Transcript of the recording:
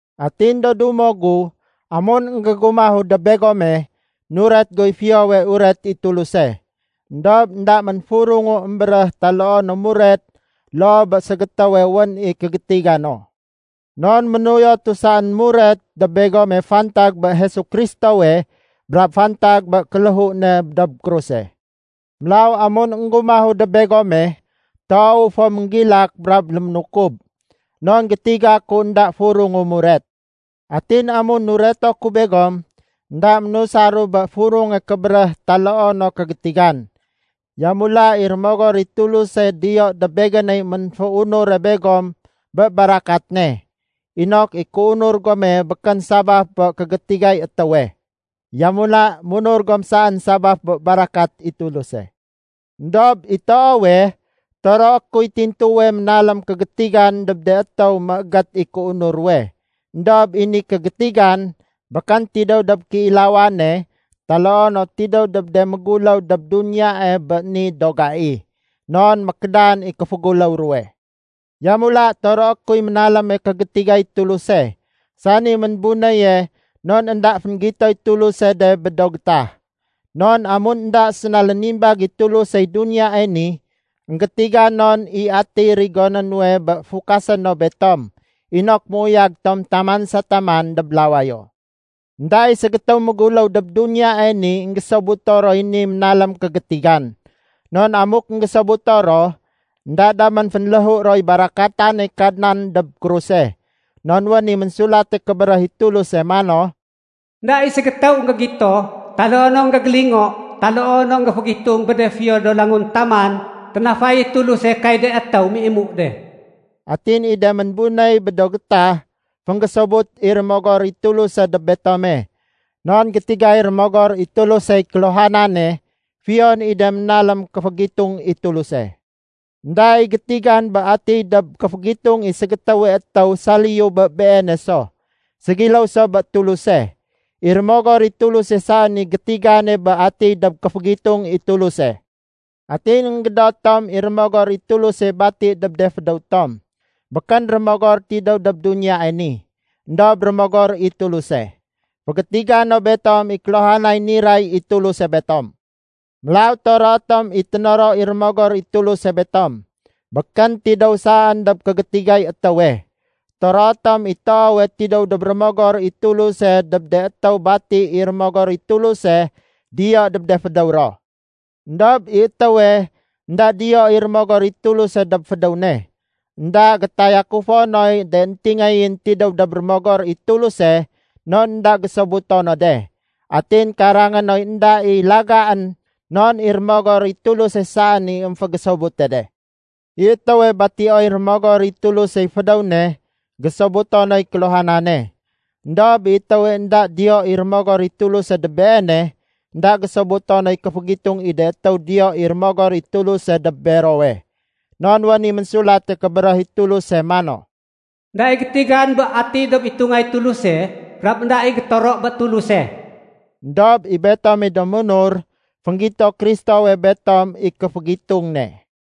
Atin do dumo gu, amun énggégumahu dob begome, nuret guy Fiyowe Uret i Tuluse. Endob énda ménfurungu émbéréh taloo no muret loo bé ségétéwe wén i kégétiga no. Non ménuyotu saén muret dob begome fantag bé Jesu Kristowe brab fantag bé kéléhu ne dob kruse. Mélaw amun énggumahu dob begome, toowu fo ménggilak brab léménukub, non gétiga ku énda furungu muret. Atin amun nureto ku begom, énda ménusaru bé furunge kébéréh taloo no kégétigan. Yamula i Rémogor i Tuluse diyo dob begéney ménféunure begom bé barakat ne, inok i kéunur gome békén sabaf bé kégétigay étéwe. Yamula munur gom saén sabaf bé barakat i Tuluse. Endob i toowe, toroé kuy tintuwe ménalém kégétigan dob de étéw méégét i kéunur ruwe. Endob i ni kégétigan békén tidéw dob kéilawane taloo no tidéw dob de méguléw dob duniyae bé ni do gai. Non mékédan i kéféguléw ruwe. Yamula toroé kuy ménaléme kégétigay Tuluse, sani ménbunéye non énda fénggitoy Tuluse de bé do gétah. Non amun énda séna lénimbag i Tulusey duniyae ni, énggétiga non i atiy rigoné nuwe bé fukasé no betom inok méuyag tom taman sa taman dob lawayo. Enda i ségétéw méguléw dob duniyae ni énggésobuto noy ni ménalém kégétigan. Non amuk énggésobuto ro, énda damén fénléhu roy barakatane Kadnan dob kruse. Non wén i Ménsulate Kébéréh i Tuluse mano, “Enda i ségétéw énggégito taloo no énggégélingo taloo no énggéfégitung bé de fiyo do languntaman ténafay i Tuluse kay de étéw méimu de.” Atin i de ménbunéy bé do gétah, fénggésobut i Rémogor i Tuluse dob betome. Non gétigay Rémogor i Tulusey kéluhanane, fiyon i de ménalém kéfégitung i Tuluse. Enda i gétigan bé atiy dob kéfégitung i ségétéwe étéw saliyu bé beene so. Ségiléw so bé Tuluse. I Rémogor i Tuluse saén i gétigane bé atiy dob kéfégitung i Tuluse. Atin énggédot tom i Rémogor i Tuluse bati dob de fédéw tom. Békén rémogor tidéw dob duniyae ni, éndob Rémogor i Tuluse. Fégétiga no betom i kéluhanay niray i Tuluse betom. Mélaw toroé tom i ténoro i Rémogor i Tuluse betom, békén tidéw saén dob kégétigay étéwe. Toroé tom i toowe tidéw dob Rémogor i Tuluse dob de étéw bati i Rémogor i Tuluse diyo dob de fédéw ro. Endob i étéwe énda diyo i Rémogor i Tuluse dob fédéw ne, énda gétayakufo noy de éntingayén tidéw dob Rémogor i Tuluse non énda gésobuto no de. Atin karangé noy énda i lagaén non i Rémogor i Tuluse saén i émfégésobute de. I étéwe batioy Rémogor i Tulusey fédéw ne, gésobuto noy kéluhanane. Endob i étéwe énda diyo i Rémogor i Tuluse dob beene, énda gésobuto noy kéfégitung i de étéw diyo i Rémogor i Tuluse dob berowe. Non wén i Ménsulate Kébéréh i Tuluse mano, “Enda i gétigan bé atiy dob itungay Tuluse brab, énda i gétoro bé Tuluse.” Endob i betome do munur, fénggito Kristowe betom i kéfégitung ne.